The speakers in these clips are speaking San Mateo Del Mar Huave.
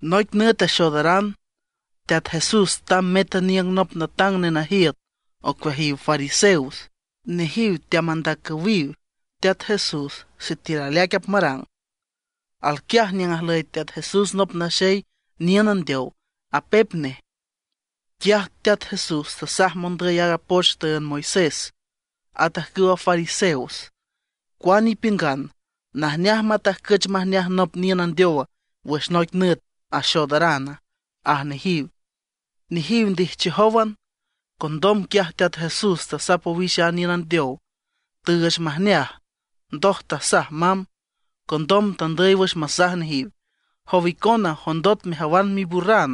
Noic nüt axoodaran, Teat Jesús tamb met aniüng nop natang nenajiüt ocueajiw fariseos. Nejiw teamandacüwiw Teat Jesús sitiül aleaic apmarang. Alquiaj niüng ajlüy Teat Jesús nop naxey niün andeow, apep nej. Quiaj Teat Jesús tasaj mondüy wüx aaga poch tüünd Moisés, at ajcüwa fariseos: ―¿Cuane ipiüngan, najneaj matajcüch majneaj nop niün andeow wüx noic nüt axoodarana? ―aj nejiw. Nejiw ndijchijówan. Condom quiaj Teat Jesús tasap owix a niün andeow, tüüch majneaj, ndoj tasaj mamb. Condom tandüy wüx masaj nejiw: ―Jow icona, jondot mejawan miburran,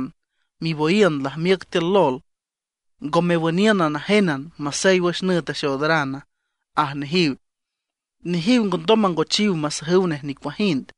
miboyiün lajmiüc tiül lol ¿ngo mewüniünan najénan masey wüx nüt axoodarana? ―aj nejiw. Nejiw ngondom mangochiw masajüw nej nicuajind.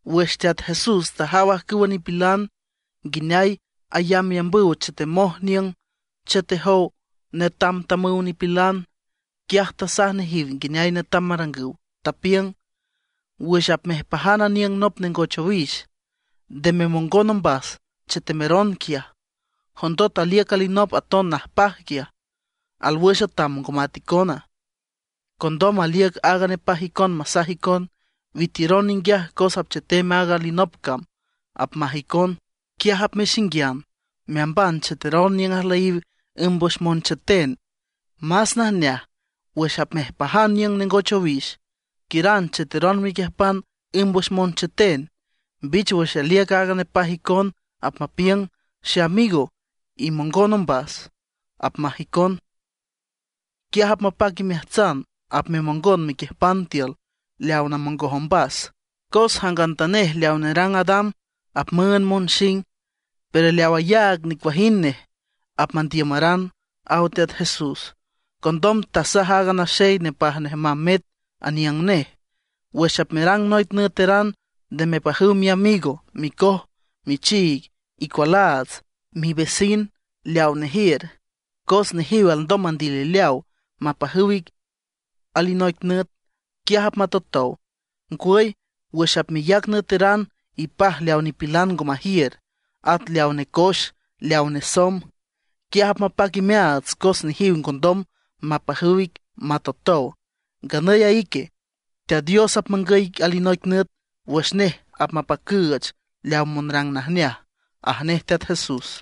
Wüx Teat Jesús tajaw ajcüwa nipilan nguineay ayambyambüw chetemoj niüng chetejow netamtamüw nipilan, quiaj tasaj nejiw nguineay netam marangüw, tapiüng: ―Wüx apmejpajan aniüng nop nengoch owix, nde memongon ombas chetemeron quiaj, jondot aliüc alinop aton najpaj quiaj, alwüx atam ngo mat icona. Condom aliüc aaga nepaj icon masaj icon: “Witiüron ninguiaj cos apchetem aaga alinop cam”, apmaj icon. Quiaj apmexinguian meamban chetemeron niüng ajlüyiw ümb wüx moncheten. Más najneaj, wüx apmejpajan niüng nengoch owix, quiüran cheteron mequiüjpan ümb wüx moncheten. Mbich wüx aliüc aaga nepaj icon apmapiüng: “Xeamigo, imongon ombas”, apmaj icon. Quiaj apmapac imeajtsan, apmemongon mequiüjpan tiül leaw namongoj ombas. Cos jangantanej leaw nerangrang adam apmüünd monxing. Pero leaw ayaag nicuajind nej, apmandiüram ―aw Teat Jesús. Condom tasaj aaga naxey nepaj nej mamb met aniüng nej: ―Wüx apmerang noic nüeteran nde mepajüw miamigo, micoj, michiig, icualaats, mivecin leaw nejiür. Cos nejiw alndom mandilileaw mapajüw ic alinoic nüt, quiaj apmatotow. Ngwüy, wüx apmeyac nüeteran ipaj leaw nipilan ngo majiür, at leaw necoex, leaw nesomb. Quiaj apmapac imeaats cos nejiw ngondom mapajüw ic matotow. Nganüy a ique, Teat Dios apmangüy ic alinoic nüt wüx nej apmapacüüch leaw monrang najneaj ―aj nej Teat Jesús.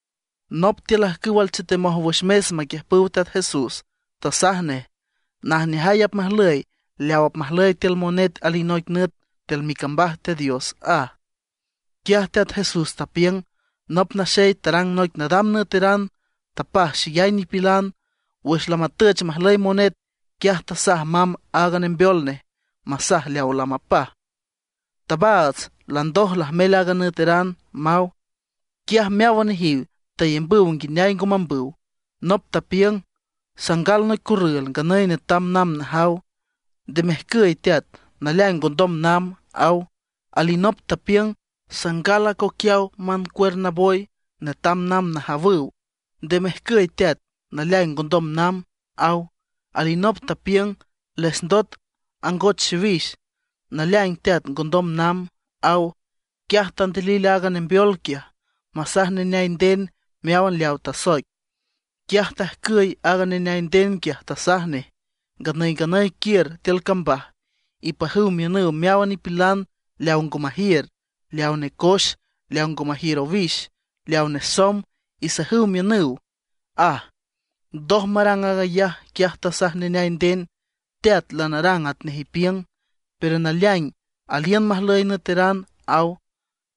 Nop tiül ajcüw alchetemoj wüx mes maquiüjpüw Teat Jesús, tasaj nej: ―Najneajay apmajlüy leaw apmajlüy tiül monet alinoic nüt tiül micambaj Teat Dios ―aj. Quiaj Teat Jesús tapiüng: ―Nop naxey tarang noic nadam nüeteran, tapaj xeyay nipilan. Wüx lamatüch majlüy monet, quiaj tasaj mamb aaga nembeol nej masaj leaw lamapaj: “Tabaats, landoj lajmel a nüeteran”, maw. Quiaj meáwan nejiw tayambüw nguineay ngo mambüw. Nop tapiüng: “Sangal noic corrül, nganüy netam namb najaw; nde mejcüy teat, naleaing ngondom namb”, aw. Alinop tapiüng: “Sangal acoquiaw mancuerna boy, netam namb najawüw; nde mejcüy teat, naleaing ngondom namb”, aw. Alinop tapiüng: “Lesndot angoch xiwix; naleaing teat, ngondom namb”, aw. Quiaj tandilil aaga nembeol quiaj masaj neneay nden meáwan leawa tasoic. Quiaj tajcüy aaga neneay nden quiaj, tasaj nej: “Nganüy nganüy quiür tiül cambaj, ipajüw miünüw meáwan nipilan leaw ngo majiür, leaw necoex, leaw ngo majiür owix, leaw nesomb; isajüw miünüw”, aj. Ndoj marang aag ayaj, quiaj tasaj neneay nden: “Teat, lanarang atnej ipiüng, pero naleaing aliün majlüy nüeteran”, aw.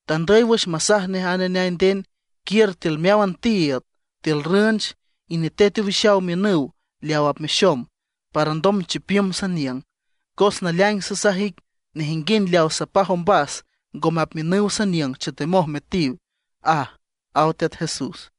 Tandüy wüx masaj nej a neneay nden: “Quiür tiül meáwan tiiüd, tiül rünch, inetet owixaw miünüw leaw apmexom, para alndom chipiüm saniüng. Cos naleaing sasaj ic, nejinguind leaw sapaj ombas ngome apmiünüw saniüng chetemoj metiw”, aj ―aw Teat Jesús.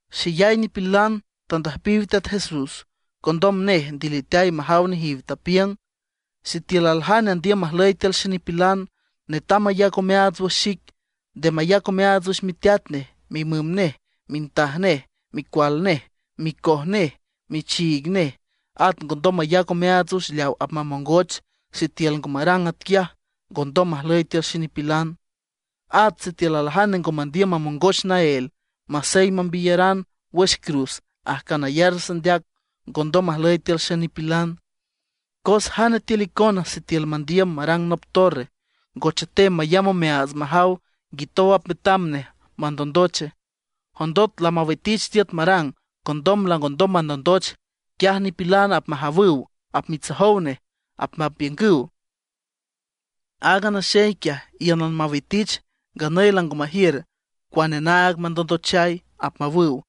Xeyay nipilan tandüjpiw Teat Jesús; condom nej ndiliteay majaw nejiw, tapiüng: ―Sitiül aljane andiüm majlüy tiül xenipilan, netam mayac omeaats wüx xic. Nde mayac omeaats wüx miteat nej, mimüm nej, mintaj nej, micual nej, micoj nej, michiig nej. At ngondom mayac omeaats wüx leaw apmamongoch. Sitiül ngo marang atquiaj ngondom majlüy tiül xenipilan. At sitiül aljane ngo mandiüm mamongoch naél, masey mambiyaran wüx cruz ajcan ayar sandeac, ngondom majlüy tiül xenipilan. ¿Cos jane tiül icona sitiül mandiüm marang nop torre, ngo chetem mayamb omeaats majaw nguitow apmetam nej mandondoche? Jondot lamawitich tiüt marang, condom langondom mandondoch; quiaj nipilan apmajawüw, apmitsojow nej. Apmapiüngüw: “Aaga naxey quiaj íünan mawitich, nganüy lango majiür cuane naag mandondochay”, apmawüw.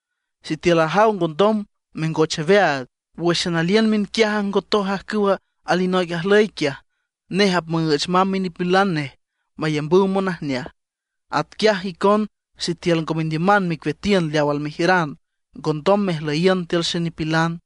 Sitiül ajaw ngondom mengoch aweaag, wǘxan aliün miünquiaj ajngotoj ajcüwa alinoic ajlüy quiaj, nej apmüüch mamb minipilan nej mayambüw monajneaj. Atquiaj icon sitiül ngo mendiüman mecueatiün leaw almejiüran, ngondom mejlüyiün tiül xenipilan.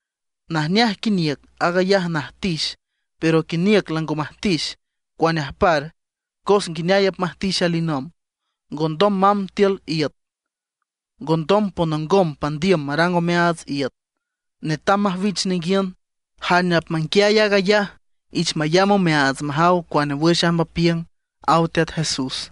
’Najneaj quiniüc aag ayaj najtix, pero quiniüc lango majtix ¿cuane ajpar, cos nguineay apmajtix alinomb? Ngondom mamb tiül iüt, ngondom ponongom pandiüm marang omeaats iüt, netam majwich ninguiün. Jane apmanguiay aag ayaj, ich mayamb omeaats majaw cuane wüx amb apiüng ―aw Teat Jesús.